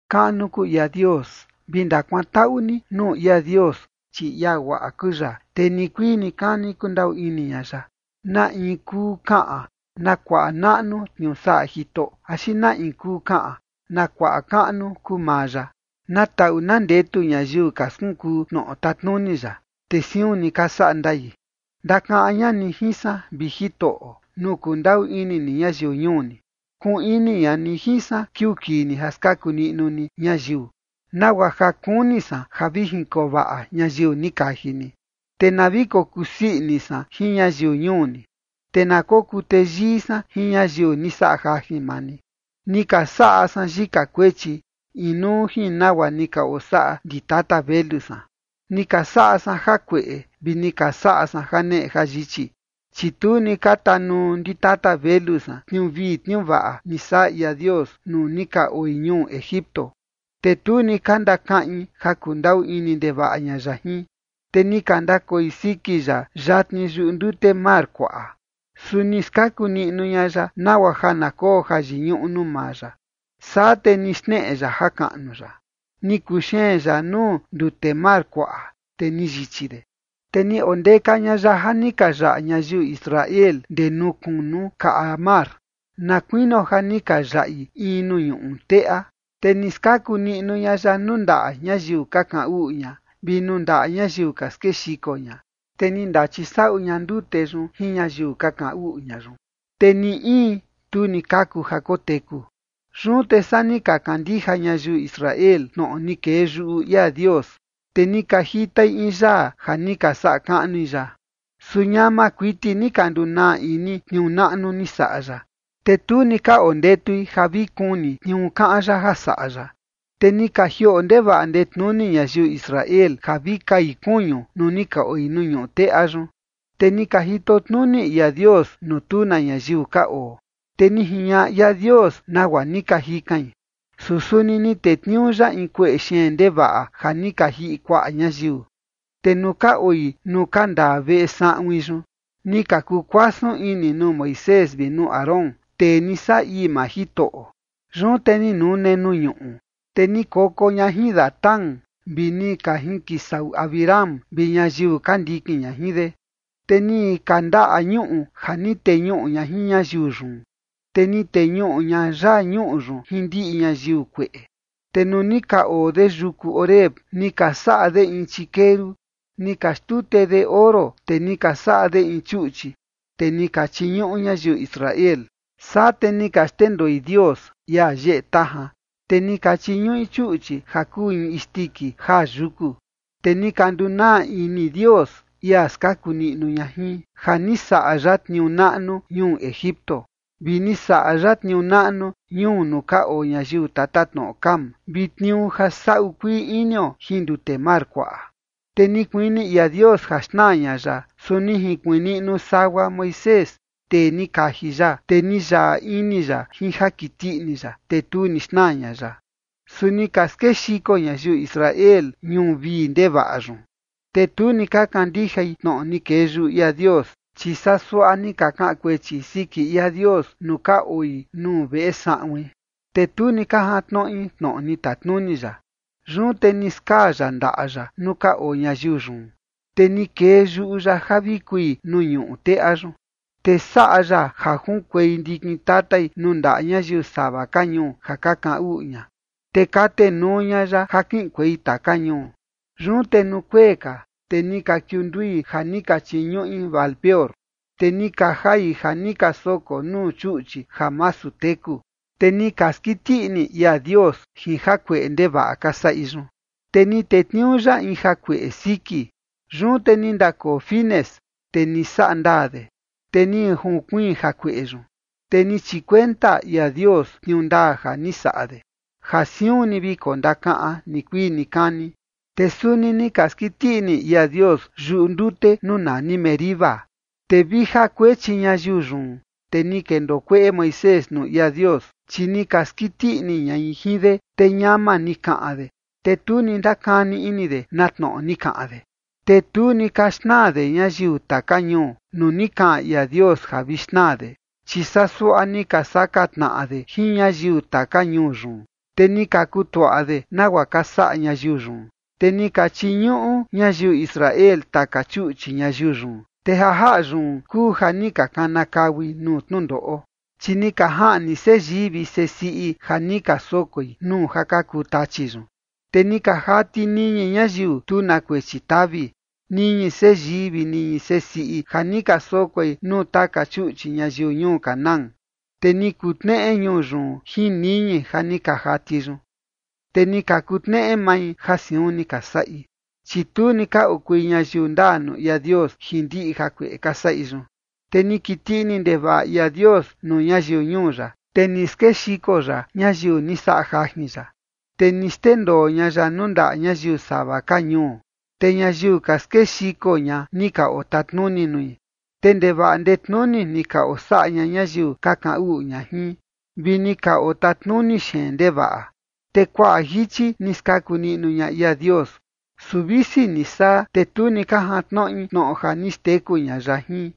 ¡Kaꞌnu kuu ia Dios! Vi ndakuantaꞌu ni nuu ia Dios, chi ia guaꞌa kuu ya. Te nikuii nikani kundaꞌu ini ña ya. ¿Na in kuu kaꞌan na kuaꞌa naꞌnu tniuu saꞌa Jitoꞌo, axi na in kuu kaꞌan na kuaꞌa kaꞌnu kuu maa ya? Na taꞌu na ndetu ñayiu ka skunkuu tnoꞌo tatnuni ya, te siun ni ka saꞌa ndai. Ndakaꞌan ña ni jin san, vi Jitoꞌo, nuu kundaꞌu ini ni ñayiu ñuu ni, kuꞌun ini ña ni jin san kiuu kii ni ja skaku niꞌnu ni ñayiu, nagua ja kuni san ja vi jinkoo vaꞌa ñayiu ni kaji ni, te na vi kokusii ini san jin ñayiu ñuu ni, te na kokuu teyii san jin ñayiu ni saꞌa jajin maa ni. Ni ka saꞌa san yika kuechi, inuu jin nagua ni ka osaꞌa ndi tata velu san, ni ka saꞌa san jakueꞌe vi ni ka saꞌa san janeꞌe jayichi. Chi tu ni ka tanuu ndi tata velu san tniuu vii tniuu vaꞌa ni saꞌa ia Dios nuu ni ka oi ñuu Egipto, te tu ni ka ndakaꞌin ja kundaꞌu ini ndevaꞌa ña ya jin, te ni ka ndakoi siki ya yatni yuꞌu ndute mar kuaꞌa. Su ni skaku niꞌnu ña ya nagua ja na koo jayiñuꞌu nuu maa ya, saa te ni xneꞌe ya jakaꞌnu ya. Ni kuxeen ya nuu ndute mar kuaꞌa, te ni yichi de, te ni ondeka ña ya ja ni ka yaꞌa ñayiu Israel ndee nuu kunu kaꞌa mar, na kuinio ja ni ka yaꞌi in nuu ñuꞌu teꞌa. Te ni skaku niꞌnu ña ya nuu ndaꞌa ñayiu ka kaꞌan uꞌu ña, vi nuu ndaꞌa ñayiu ka skexiko ña. Te ni ndachisaꞌu ña ndute yun jin ñayiu ka kaꞌan uꞌu ña yun, te ni in tu ni kaku ja koteku. Yun te saa ni ka kandija ñayiu Israel tnoꞌo ni kee yuꞌu ia Dios, te ni ka jitai in yaa ja ni ka saꞌa kaꞌnui ya. Su ñama kuiti ni ka ndunaa ini tniuu naꞌnu ni saꞌa ya, te tu ni ka ondetui ja vi kuni tniuu kaꞌan ya ja saꞌa ya. Te ni ka jioꞌo ndevaꞌa ndetnuni ñayiu Israel ja vi kai kuñu nuu ni ka oi nuu ñuꞌu teꞌa yun, te ni ka jito tnuni ia Dios nuu tu na ñayiu ka oo. Te ni jiñaꞌa ia Dios nagua ni ka jikain, su suni ni tetniuu ya in kueꞌe xeen ndevaꞌa ja ni ka jiꞌi kuaꞌa ñayiu. Te nuu ka oi nuu ka ndaa veꞌe saꞌuin yun, ni ka kukuasun ini nuu Moisés vi nuu Aarón, tee ni saꞌa ii maa Jitoꞌo. Yun te ni nune nuu ñuꞌu, te ni koko ña jin Datán vi ni ka jinkisaꞌu Abiram, vi ñayiu ka ndikin ña jin de. Te ni kandaꞌa ñuꞌu ja ni teñuꞌu ña jin ñayiu yun, te ni teñuꞌu ña yaa ñuꞌu yun jin ndiꞌi ñayiu kueꞌe. Te nuu ni ka oo de yuku Horeb, ni ka saꞌa de in chikeru, ni ka xtute de oro, te ni ka saꞌa de in chuꞌchi, te ni ka chiñuꞌu ñayiu Israel. Saa te ni ka xndendoi Dios, ia yeꞌe tajan, te ni ka chiñuꞌi chuꞌchi ja kuu in isndiki jaa yuku. Te ni ka ndunaa ini Dios, ia ni skaku niꞌnu ña jin, ja ni saꞌa ya tniuu naꞌnu ñuu Egipto. Vi ni saꞌa ya tniuu naꞌnu ñuu nuu ka oo ñayiu tatatnoꞌo Cam, vi tniuu ja saꞌu kuii inio jin ndute mar kuaꞌa. Te ni kuini ia Dios ja xnaa ña ya, su ni jinkuiin niꞌnu sagua Moisés, tee ni kaji ya, te ni yaꞌa ini ya jin ja kiti ini ya, te tu ni xnaa ña ya. Su ni ka skexiko ñayiu Israel ñuu vii ndevaꞌa yun, te tu ni ka kandijai tnoꞌo ni kee yuꞌu ia Dios. Chi saa suaꞌa ni ka kaꞌan kuechi siki ia Dios nuu ka oi nuu veꞌe saꞌuin, te tu ni ka jantnoꞌi tnoꞌo ni tatnuni ya. Yun te ni skaa ya ndaꞌa ya nuu ka oo ñayiu yun, te ni kee yuꞌu ya ja vi kui nuu ñuꞌu teꞌa yun. Te saꞌa ya ja junkuei ndikin tatai nuu ndaꞌa ñayiu sava ka ñuu ja ka kaꞌan uꞌu ña, te katenuu ña ya ja kiꞌinkuei taka ñuu. Yun te nuu kuee ka, te ni ka kiundui ja ni ka chiñuꞌi Baal-peor, te ni ka jai ja ni ka soko nuu chuꞌchi ja masu teku. Te ni ka skiti ini ia Dios jin jakueꞌe ndevaꞌa ka saꞌi yun, te ni tetniuu ya in jakueꞌe siki. Yun te ni ndakoo Finees, te ni saꞌa ndaa de, te ni junkuiin jakueꞌe yun. Te ni chikuenta ia Dios tniuu ndaa ja ni saꞌa de, ja siun ni vi kondakaꞌan nikuii nikani. Te suni ni ka skiti ini ia Dios yuꞌu ndute nuu nani Meriba, te vi ja kuechi ñayiu yun, te ni kendoo kueꞌe Moisés nuu ia Dios. Chi ni ka skiti ini ñai jin de, te ñama ni kaꞌan de, te tu ni ndakani ini de na tnoꞌo ni kaꞌan de. Te tu ni ka xnaa de ñayiu taka ñuu nuu ni kaꞌan ia Dios ja vi xnaa de. Chi saa suaꞌa ni ka saka tnaꞌa de jin ñayiu taka ñuu yun, te ni ka kutuaꞌa de nagua ka saꞌa ñayiu yun. Te ni ka chiñuꞌu ñayiu Israel taka chuꞌchi ñayiu yun, te ja jaꞌa yun kuu ja ni ka kanakaui nuu tnundoꞌo. Chi ni ka jaꞌni seyii vi sesiꞌi ja ni ka sokoi nuu ja ka kuu tachi yun. Te ni ka jati niñi ñayiu tu na kuechi tavi, niñi seyii vi niñi sesiꞌi ja ni ka sokoi nuu taka chuꞌchi ñayiu ñuu Canaán, te ni kutneꞌe ñuu yun jin niñi ja ni ka jati yun. Te ni ka kutneꞌe mai ja siun ni ka saꞌi, chi tu ni ka okui ñayiu ndaa nuu ia Dios jin ndiꞌi jakueꞌe ka saꞌi yun. Te ni kiti ini ndevaꞌa ia Dios nuu ñayiu ñuu ya, te ni skexiko ya ñayiu ni saꞌa jajin ya. Te ni xndendoo ña ya nuu ndaꞌa ñayiu sava ka ñuu, te ñayiu ka skexiko ña, ni ka otatnuni nui. Te ndevaꞌa ndetnuni ni ka osaꞌa ña ñayiu ka kaꞌan uꞌu ña jin, vi ni ka otatnuni xeen ndevaꞌa. Te kuaꞌa jichi ni skaku niꞌnu ña ia Dios, su visi ni saa, te tu ni ka jantnoꞌi tnoꞌo ja ni xteku ña ya jin,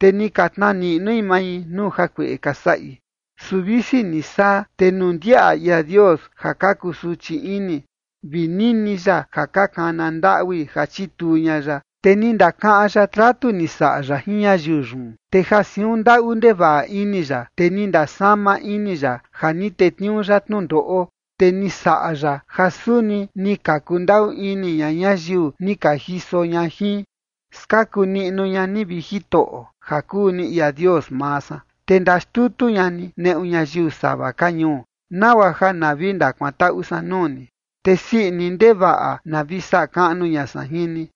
te ni ka tnaa niꞌnui mai nuu jakueꞌe ka saꞌi. Su visi ni saa, te nuu ndiaꞌa ia Dios ja ka kusuchi ini, vi nini ya ja ka kana ndaꞌui ja chituu ña ya, te ni ndakaꞌan ya tratu ni saꞌa ya jin ñayiu yun, te ja siun ndaꞌu ndevaꞌa ini ya, te ni ndasama ini ya ja ni tetniuu ya tnundoꞌo. Te ni saꞌa ya ja suni ni ka kundaꞌu ini ña ñayiu ni ka jiso ña jin. Skaku niꞌnu ña ni, vi Jitoꞌo, ja kuu ni ia Dios maa san, te ndaxtutu ña ni neꞌu ñayiu sava ka ñuu, nagua ja na vi ndakuantaꞌu san nuu ni, te sii ini ndevaꞌa na vi saꞌa kaꞌnu ña san jin ni.